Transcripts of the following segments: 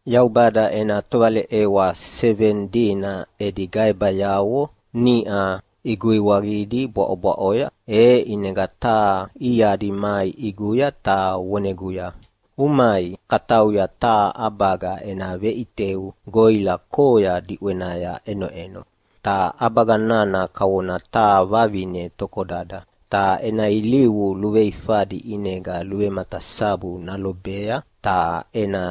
Yaubada ena tovaleʼewa seveni dina edi gaebayavo niʼa iguiwaqidi bwaʼobwaʼoya, e ʼinega taha iadi mai ʼiguya ta voneguya, “Umai, katauya taha ʼabaga ena veʼiteu goʼila koya diʼwenaya ʼenoʼeno. Ta ʼabaga nana kavona taha vavine tokodada, ta ena ilivu luveifadi ʼinega luvematasabu nalobea ta ena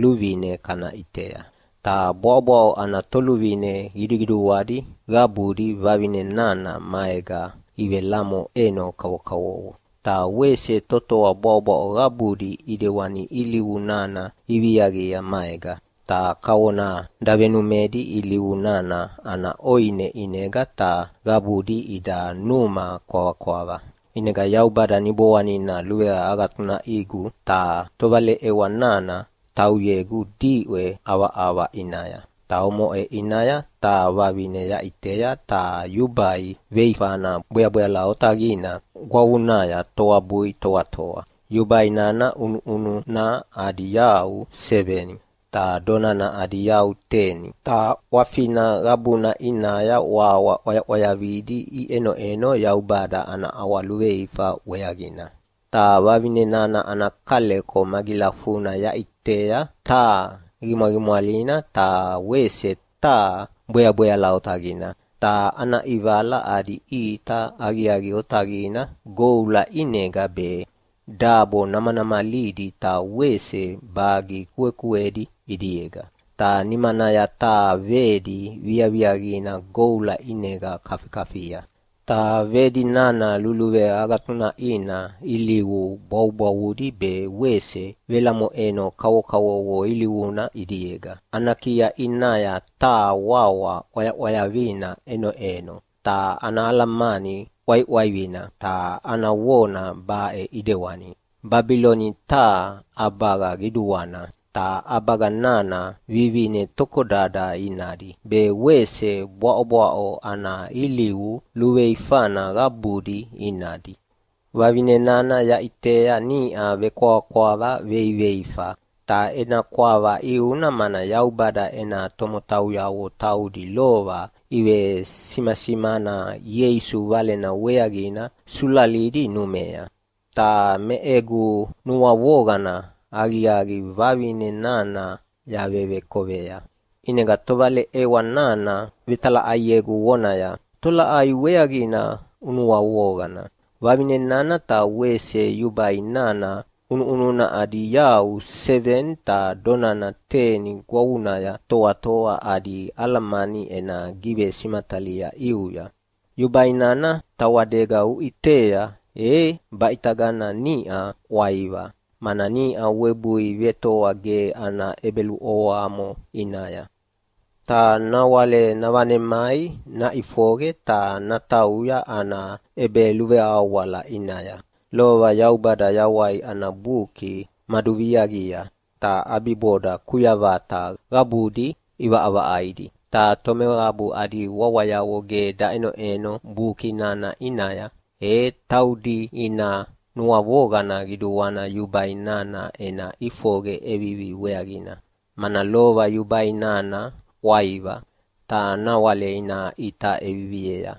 luvine kana ʼitea. Ta bwaʼobwaʼo ana toluvine qiduqiduadi qabudi vavine nana maega ivelamoʼeno kavokavovo. Ta wese totoa bwaʼobwaʼo qabudi ʼidewani ilivu nana iviaqia maega, ta kavona davenumedi ilivu nana ana ʼoine ʼinega ta qabudi ida numa kwavakwava.” ʼInega Yaubada Niboanina luveagatunaʼigu ta tovaleʼewa nana tauyegu diʼwe ʼavaʼava ʼinaya. Ta omoʼe ʼinaya taha vavine yaʼitea taha yubai veifana bweabweala otaqina gwavunaya toabui toatoa. Yubai nana ʼunuʼununa adi yau seveni, ta donana adi yau teni. Ta ʼwafina qabuna ʼinaya wawa ʼwayaʼwayavidi iʼenoʼeno Yaubada ana ʼawaluveifa weaqina. Ta vavine nana ana kaleko magilafuna yaʼitea taha qimwaqimwalina ta wese taha bweabweala otaqina, ta ana ʼivala adi ʼita aqiaqi otaqina goula ʼinega be, dabo namanamalidi ta wese bagi kuekuedi ʼidiega. Ta nimanaya taha vedi viaviaqina goula ʼinega kafikafia, ta vedi nana luluveagatunaʼina ilivu bwavubwavudi be wese velamoʼeno kavokavovo ilivuna ʼidiega. Ana kia ʼinaya taha wawa ʼwayaʼwayavina ʼenoʼeno, ta ana alamani ʼwaiʼwaivina, ta ana vona baʼe ʼidewani, ‘Babiloni taha ʼabaga qiduana, ta ʼabaga nana vivine tokodada inadi be wese bwaʼobwaʼo ana ilivu luveifana qabudi inadi.” Vavine nana yaʼitea niʼa vekwavakwava veiveifa. Ta ena kwava ʼiuna mana Yaubada ena tomotauyavo taudi lova ivesimasimana Ieisu Valena weaqina sulalidi numea. Ta me egu nuavoqana aqiaqi vavine nana yavevekovea. ʼInega tovaleʼewa nana vetalaʼaiegu vonaya, “Tolaʼai weaqina unuavoqana? Vavine nana ta wese yubai nana ʼunuʼununa adi yau seveni ta donana teni gwavunaya toatoa adi alamani ena givesimatalia ʼiuya. Yubai nana tawadega uʼitea e baʼitagana niʼa ʼwaiva, mana niʼa webui vetoa ge ana ʼebeluʼovoamo ʼinaya, ta nawale navanemai naʼifoqe ta natauya ana ʼebeluveawala ʼinaya. Lova Yaubada Yawai ana Buki maduviaqia, ta ʼabiboda kuyavata qabudi ʼivaʼavaʼaidi. Ta tomeqabu adi wawayavo ge daʼenoʼeno buki nana ʼinaya, e taudi ina nuavoqana qiduana yubai nana ena ʼifoqe ʼevivi weaqina, mana lova yubai nana ʼwaiva, ta nawale ina ʼita ʼeviviea.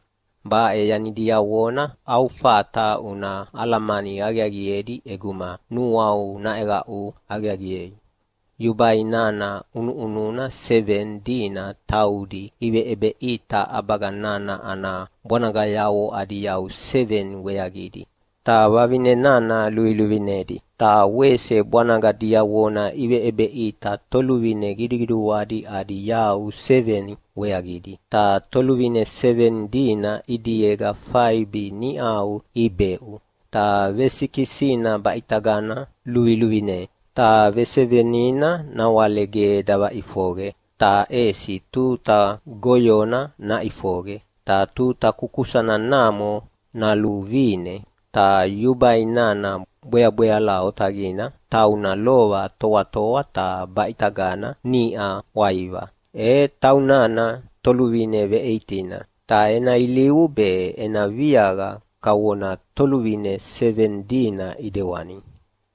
“Baʼe yani diavona au fata una alamani aqiaqiedi ʼeguma nuau naʼeqaʼu aqiaqiei. Yubai nana ʼunuʼununa seveni dina taudi iveʼebeʼita ʼabaga nana ana bwanagayavo adi yau seveni weaqina, ta vavine nana luviluvinedi. Ta wese bwanaga diavona iveʼebeʼita toluvine qiduqiduadi adi yau seveni weaqina. Ta toluvine seveni dina ʼidiega faibi niʼa ibeʼu, ta vesikisina baʼitagana luviluvine, ta vesevenina nawale ge davaʼifoqe, ta ʼesi tuta goyona naʼifoqe, ta tuta kukusana namo naluvine. Ta yubai nana bweabweala otaqina tauna lova toatoa ta baʼitagana niʼa ʼwaiva, e taunana toluvine veʼeitina. Ta ena ilivu be ena viaqa kavona toluvine seveni dina ʼidewani,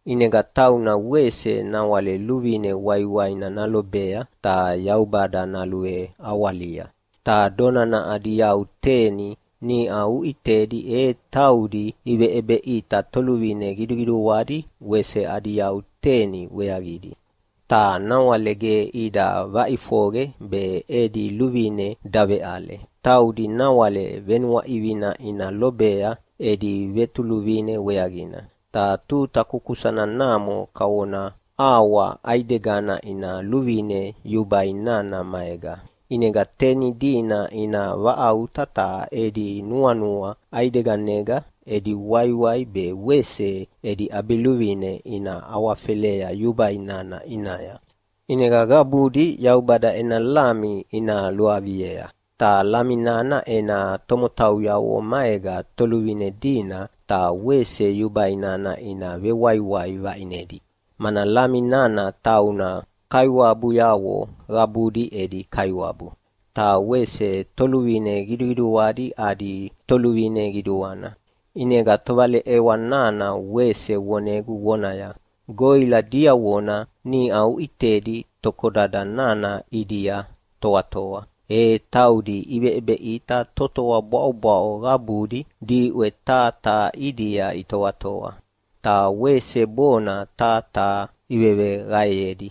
ʼinega tauna wese nawale luvine waiwaina nalobea ta Yaubada naluveawalia. “Ta donana adi yau teni niʼa uʼitedi e taudi iveʼebeʼita toluvine qiduqiduadi wese adi yau teni weaqidi, ta nawale ge ida vaʼifoqe be edi luvine daveʼale. Taudi nawale venuaʼivina ina lobea edi vetoluvine weaqina, ta tuta kukusana namo kavona auwa ʼaidegana ina luvine yubai nana maega. ʼInega teni dina ina vaʼauta ta edi nuanua ʼaideganega edi waiwai be wese edi ʼabiluvine ina awafelea yubai nana ʼinaya. ʼInega qabudi Yaubada ena Lami ina luaviea. Ta Lami nana ena tomotauyavo maega toluvine dina ta wese yubai nana ina vewaiwai vaʼinedi, mana Lami nana tauna kaiwabuyavo qabudi edi Kaiwabu, ta wese toluvine qiduqiduadi adi Toluvine Qiduana.” ʼInega tovaleʼewa nana wese vonegu vonaya, “Goʼila diavona niʼa uʼitedi tokodada nana ʼidia toatoa, e taudi iveʼebeʼita totoa bwaʼobwaʼo qabudi diʼwe taha taha ʼidia itoatoa, ta wese bona taha taha iveveqaeyedi.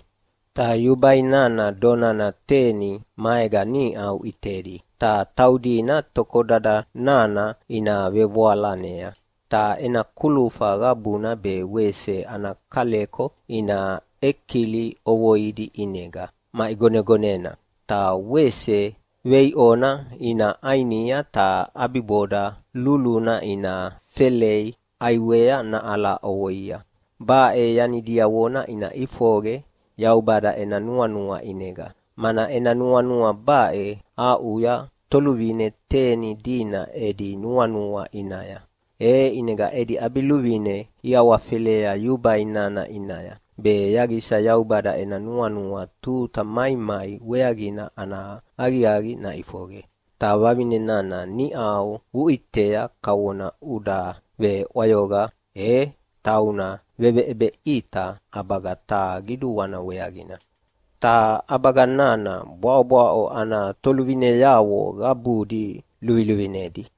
Ta yubai nana donana teni maega niʼa uʼitedi, ta taudina tokodada nana ina vevoalanea, ta ena kulufa qabuna be wese ana kaleko ina ʼekili ʼovoidi ʼinega maʼigonegonena. Ta wese veiʼona ina ʼainia ta ʼabiboda luluna ina felei ʼaiwea naʼala ʼovoia. Baʼe yani diavona ina ʼifoqe Yaubada ena nuanua ʼinega, mana ena nuanua baʼe aʼuya toluvine teni dina edi nuanua ʼinaya. E ʼinega edi ʼabiluvine iawafelea yubai nana ʼinaya, be yaqisa Yaubada ena nuanua tuta maimai weaqina ana aqiaqi naʼifoqe. Ta vavine nana niʼa uʼitea kavona uda veʼwayoqa, e tauna veveʼebeʼita ʼabaga taha qiduana weaqina, ta ʼabaga nana bwaʼobwaʼo ana toluvineavo qabudi luviluvinedi.”